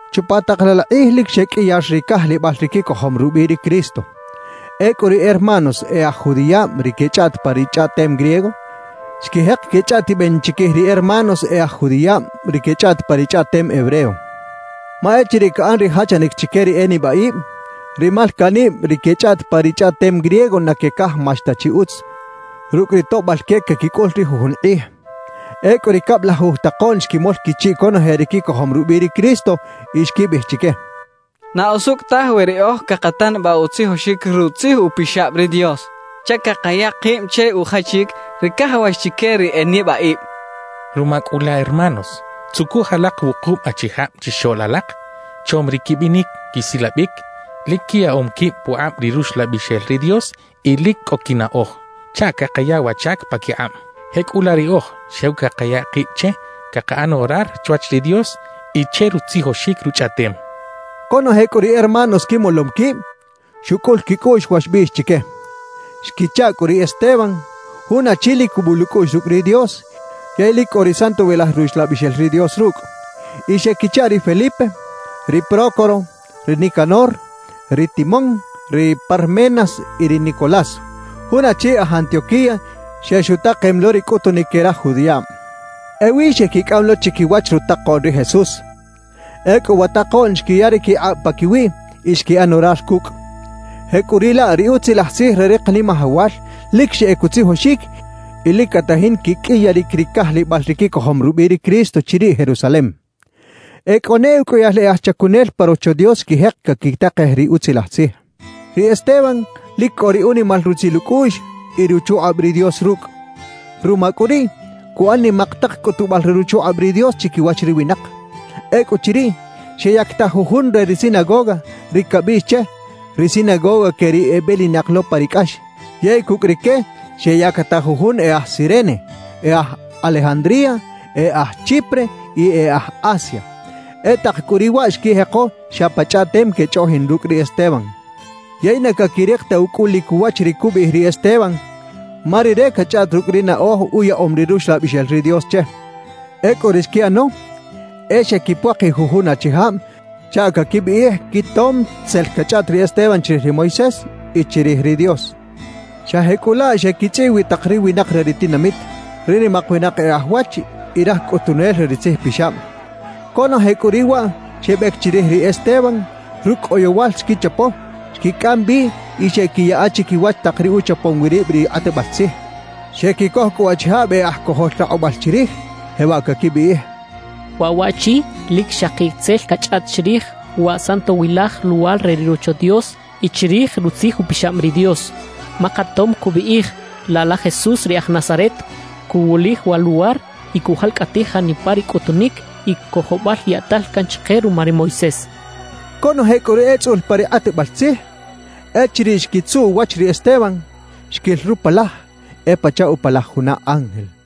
Chupa tak laꞌ la kꞌij lic xeqꞌuiyar ri cajlibal ri quicojom rubiꞌ ri Cristo. Ecꞌu ri hermanos e aj judiꞌab ri quechꞌaꞌt pa ri chꞌaꞌtem griego, xquijek quechꞌaꞌtiben chiquij ri hermanos e aj judiꞌab ri quechꞌaꞌt pa ri chꞌaꞌtem hebreo. Ma echiriꞌ caꞌan ri jachanic chique ri e nibaꞌib, ri malcaꞌnib ri quechꞌaꞌt pa ri chꞌaꞌtem griego na quecajmax ta chi utz rucꞌ ri toꞌbal que caquicꞌul ri jujun kꞌij. Ecꞌu ri cablajuj takoꞌn xquimol quichiꞌ conoje ri quicojom rubiꞌ ri Cristo y xquibiꞌij chique: «Na usucꞌ taj we riꞌoj cakatanabaꞌ utzijoxic Rutzij Upixab ri Dios chaꞌ cakaya kib che ujachic ri cajawax chique ri e nibaꞌib. Ruma cꞌu laꞌ hermanos, tzucuj alak wukub achijab chixoꞌl alak, chom ri quibinic quisilabic, lic quiyaꞌom quib pukꞌab ri Ruxlabixel ri Dios y lic cꞌo quinaꞌoj, chaꞌ cakaya wa chac paquikꞌab. Jecꞌulaꞌ riꞌoj xew cakaya kib che cakaꞌan orar chwach ri Dios y che rutzijoxic Ruchꞌaꞌtem» xechaꞌ. Conoje cꞌu ri hermanos quimolom quib, xucꞌul quicꞌuꞌx wa xbiꞌx chique. Xquichaꞌ cꞌu ri Esteban, jun achi lic cubul ucꞌuꞌx rucꞌ ri Dios yey lic cꞌo ri Santowilaj Ruxlabixel ri Dios rucꞌ. Y xequichaꞌ ri Felipe, ri Prócoro, ri Nicanor, ri Timón, ri Parmenas y ri Nicolás, jun achi aj Antioquía xex utakem lo ri cꞌutunic que raj judiꞌab. Ewi xequicꞌam lo chiquiwach rutakoꞌn ri Jesús. Ecꞌu wa takoꞌn xquiya ri quikꞌab paquiwiꞌ y xquiꞌan orar cucꞌ. Jecꞌuriꞌlaꞌ ri Utzilaj Tzij re ri Kanimajawal lic xeꞌec utzijoxic y lic catajin quiqꞌuiyaric ri cajlibal ri quicojom rubiꞌ ri Cristo chiriꞌ Jerusalem. E cꞌo ne uqꞌuiyal e aj chacunel pa Rocho Dios xquijek caquitakej ri Utzilaj Tzij. Ri Esteban lic cꞌo ri unimal rutzil ucꞌuꞌx y ruchukꞌab ri Dios rucꞌ. Ruma cꞌu riꞌ, cuꞌan nimak tak cꞌutubal re ruchukꞌab ri Dios chiquiwach ri winak. Ecꞌuchiriꞌ, xeyactaj jujun re ri sinagoga, ri cabiꞌx che “Ri sinagoga que ri ebelinak lo pa ri cꞌax”, yey cucꞌ rique xeyactaj jujun e aj Cirene, e aj Alejandría, e aj Chipre y e aj Asia. E tak cꞌu riꞌ waꞌ xquijeko xa pa chꞌaꞌtem quechꞌoꞌjin rucꞌ ri Esteban. Yey na caquirik ta ucꞌulic uwach ri cubiꞌij ri Esteban ma rire cachꞌaꞌt rucꞌ ri naꞌoj uyaꞌom ri Ruxlabixel ri Dios che. Ecꞌu ri xquiꞌano e xequipuakij jujun achijab chaꞌ caquibiꞌij quitom tzel cachꞌaꞌt ri Esteban chirij ri Moisés y chirij ri Dios. Xa jecꞌulaꞌ xequichꞌiꞌ wi tak ri winak re ri tinamit, ri nimak winak e aj wach y raj cꞌutunel re ri tzijpixab. Conoje cꞌu riꞌ waꞌ xebec chirij ri Esteban; rucꞌ oyowal xquichapo, xquicꞌam bi y xeꞌquiyaꞌa chiquiwach tak ri uchapom wi rib ri kꞌatbal tzij. Xequicoj cꞌu achijab e aj cojol rakꞌubal chirij, jewaꞌ caquibiꞌij: «Waꞌ waꞌchi lic xaki tzel cachꞌaꞌt chirij wa Santowilaj Luwar re ri Rocho Dios y chirij Rutzij Upixab ri Dios. Ma katom cubiꞌij, laꞌ la Jesús ri aj Nazaret cuwulij wa luwar y cujalcꞌatij janipa ri cꞌutunic y cojobal yaꞌtal can chike ruma ri Moisés» xechaꞌ. Conoje cꞌu ri etzꞌul pa ri kꞌatbal tzij, echiriꞌ xquitzuꞌ uwach ri Esteban, xquil rupalaj e pachaꞌ upalaj juna ángel.